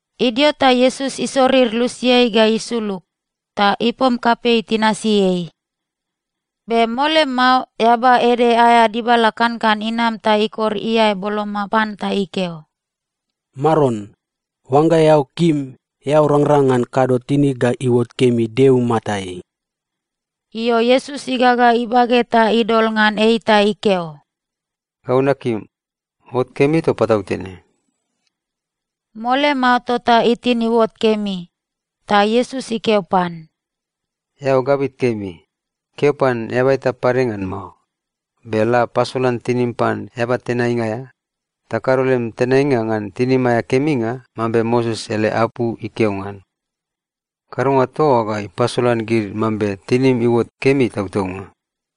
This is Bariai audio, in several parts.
Idio ta Iesus isorir lusiai ga isulug, ta ipom kapei tinasi ei. Be mole mao eaba ede aea dibala kankan inam ta ikor iae boloma pan ta ikeo, “Maron, oangga eao kim, eao rangrang ngan kado tinig ga iuot kemi Deo imatai.” Io, Iesus igaga ibage ta idol ngan ei ta ikeo, “Gau nakim. Ot kemi toa patautene.” Mole mao, tota itin iuot kemi. Ta Iesus ikeo pan, “Eao gabit kemi. Keo pan eaba eta pade ngan mao. Be la pasolan tinim pan eaba tenainga aea, ta kado lem tenainga ngan tinim aea keminga, mambe Moses ele apu ikeo ngan. Kadonga toa oa ga ipasolan gid mambe tinim iuot kemi tautaunga.”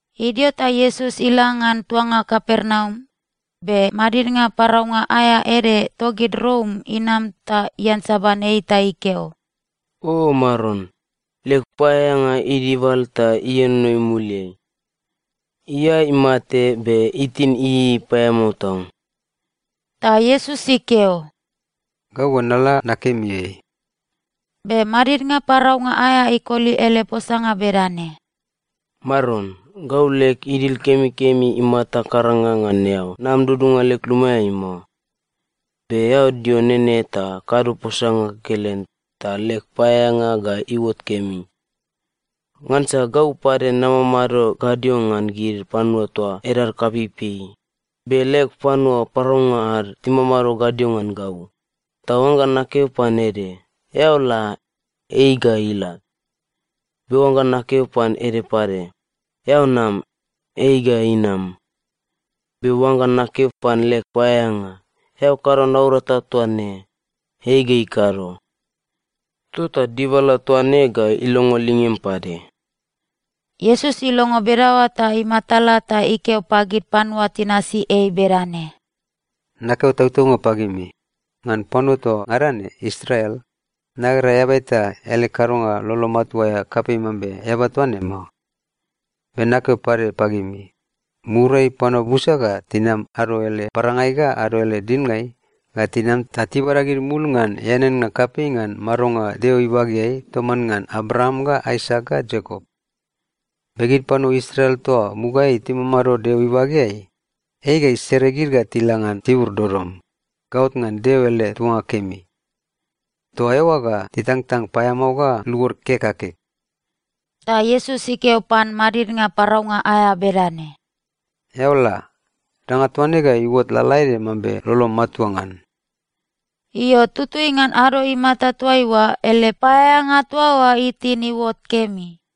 Idio ta Iesus ila ngan tuanga Kapernaum, be madidnga paraunga aea ede togid Rom inam ta iansaban ei ta ikeo, “O Maron, leg paeaeanga idibal ta ienono imuliai. Iae imate, be itin ieiei paeamao tau.” Ta Iesus ikeo, “Gau ga nala nakemi ei.” Be madidnga paraunga aea ikoli ele posanga bedane, “Maron, gau leg idil kemikemi imata karanga ngan eao nam dudunga leg lumaeai mao. Be eao dio nene ta kado posanga kekelen, ta leg paeaeanga ga iuot kemi. Ngansa gau pade namamado gadio ngan gid panua toa edad kapeipei, be leg panua paraunga ad timamado gadio ngan gau. Ta oangga nakeo pan ede, ‘Eao la,’ ei ga ila. Be oangga nakeo pan ede pade, ‘Eao nam,’ ei ga inam. Be oangga nakeo pan leg paeaeanga, ‘Eao kado naurata toa ne,’ ei ga ikado. Tota dibala toa ne ga ilongo lingem pade.” Iesus ilongo bedaoa ta imatala ta ikeo pagid panua tinasi ei bedane, “Nakeo tautaunga pagimi, ngan panua toa ngada ne Israel, nagera eaba eta ele kadonga lolo matua aea kapei mambe eaba toa ne mao. Be nakeo pade pagimi, muriai panua busa ga tinam ado ele parangai ga ado ele dilngai ga tinam ta tibada gid mul ngan eaneannga kapei ngan madonga Deo ibageai toman ngan Abraam ga Aisak ga Iakop. Be gid panua Israel toa mugaeai timamado Deo ibageai, ei ga isere gid ga tila ngan tibur dodom, gaot ngan Deo ele tuanga kemi. Toa eoa ga titangtang paeamao ga luod kek ga kek.” Ta Iesus ikeo pan madidnga paraunga aea bedane, “Eao la. Danga toa ne ga iuot lalaede mambe lolom matua ngan.” Io, tutui ngan ado imata toaiua, ele paeaeanga toa oa itin iuot kemi.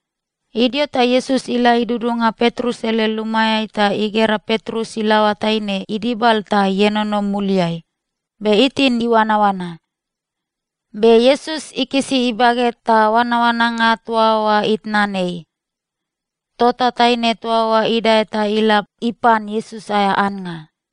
Idio ta Iesus ila idudunga Petrus ele lumaeai ta igera Petrus ilaoa taine idibal ta ienono imuliai, be itin iuanaoana. Be Iesus ikisi ibage ta oanaoananga toa oa itnan ei. Tota taine toa oa idae ta ila ipan Iesus aea annga.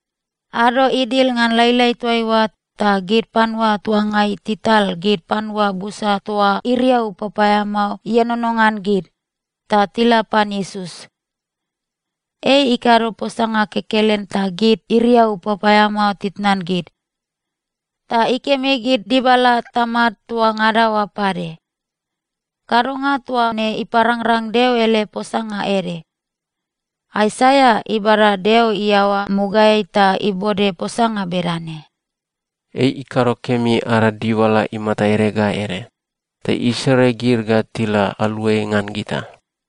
Ado idil ngan lailai toaiua, ta gid panua tuangai tital gid panua busa toa iriau papaeamao ienono ngan gid, ta tila pan Iesus. Ei ikado posanga kekelen ta gid iriau papaeamao titnan gid. Ta ikemi gid dibala tamad toa ngada oa pade. Kadonga toa ne iparangrang Deo ele posanga ede. Aisaia ibada Deo iaoa mugaeai ta ibode posanga bedane, “Ei ikado kemi ada dibala imata ede ga ede, ta isere gid ga tila aluai ngan gita.”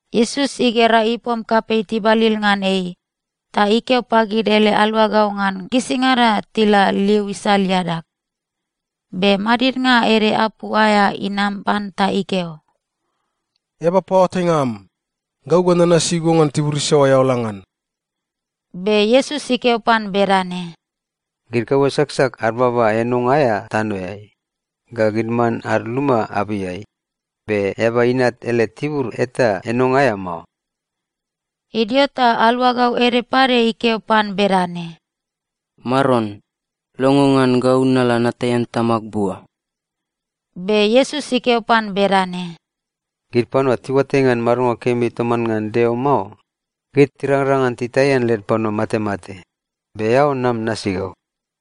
Iesus igera ipom kapei tibalil ngan ei, ta ikeo pagid ele aluagau ngan gisingada tila liu isal iadag. Be madidnga ede apu aea inam pan ta ikeo, “Eaba paoatainga am, gau ga nanasi go ngan tibur isaoa eao la ngan.” Be Iesus ikeo pan bedane, “Gid kaua saksak ad baba enonga aea tanoeai, ga gid man ad luma abeiai, be Eaba Inat ele tibur eta enonga aea mao.” Idio ta aluagau ede pade ikeo pan bedane, “Maron, longo ngan gau nala nataian tamag bua.” Be Iesus ikeo pan bedane, “Gid panua tiuatai ngan madonga kemi toman ngan Deo mao, gid tirangrang ngan titaian led panua matemate, be eao nam nasi gau.”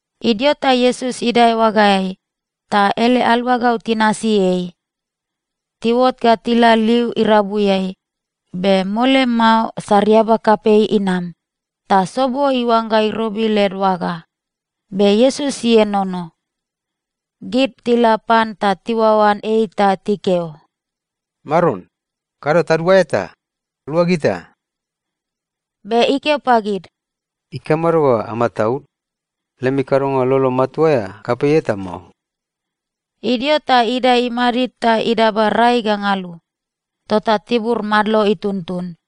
Idio ta Iesus idae oagaeai, ta ele aluagau tinasi ei. Tiuot ga tila liu irabuiai, be mole mao sariaba kapei inam, ta sobo iuangga irobi led oaga. Be Iesus ienono. Gid tila pan ta tiuaoan ei ta tikeo, “Maron, kado taduaea ta! Lua gita!” Be ikeo pagid, “Ikamado ga amataud? Lemi kadonga lolo matua aea kapei eta mao.” Idio ta idae imadid ta idaba rai ga ngalu. Tota tibur madlo ituntun.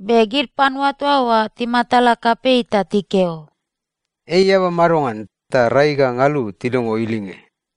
Be gid panua toa oa timatala kapei ta tikeo, “Ei eaba madongan ta rai ga ngalu tilongo ilinge?”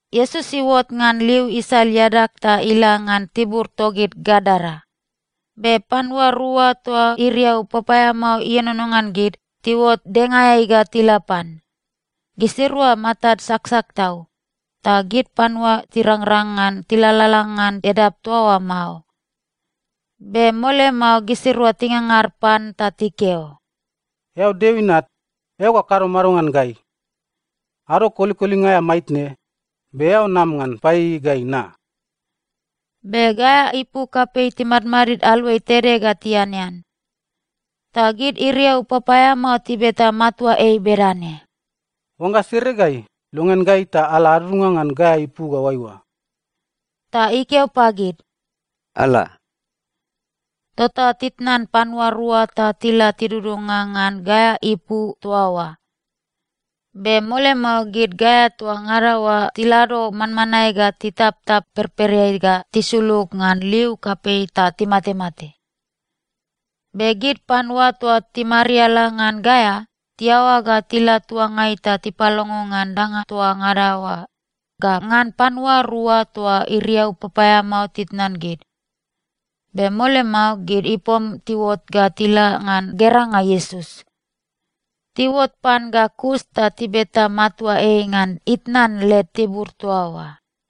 Iesus iuot ngan liu isal iadag ta ila ngan tibur togid Gadara. Be panua rua toa iriau papaeamao ienono ngan gid, tiuot dengaeai ga tila pan. Gisirua matad saksak tau, ta gid panua tirangrang ngan tilalala ngan edap toa oa mao. Be mole mao gisirua tingangar pan ta tikeo, “Eao Deo Inat, eao ga kado mado ngan gai? Ado kolikolinga aea maitne, be eao nam ngan paieiei gai na?” Be gaea ipu kapei timadmadid aluai tede ga tianean. Ta gid iriau papaeamao tibeta matua ei bedane, “Oangga sere gai, longean gai ta ala adudunga ngan gaea ipu ga oaiua.” Ta ikeo pagid, “Ala!” Tota titnan panua rua ta tila tidudunga ngan gaea ipu toa oa. Be mole mao, gid gaea toa ngada oa tilado manmanae ga titaptap perpereai ga tisulug ngan liu kapei ta timatemate. Be gid panua toa timariala ngan gaea, tiaoa ga tila tuangai ta tipalongo ngan danga toa ngada oa, ga ngan panua rua toa iriau papaeamao titnan gid. Be mole mao, gid ipom tiuot ga tila ngan geranga Iesus. Tiuot pan ga kus ta tibeta matua ei ngan itnan led tibur toa oa.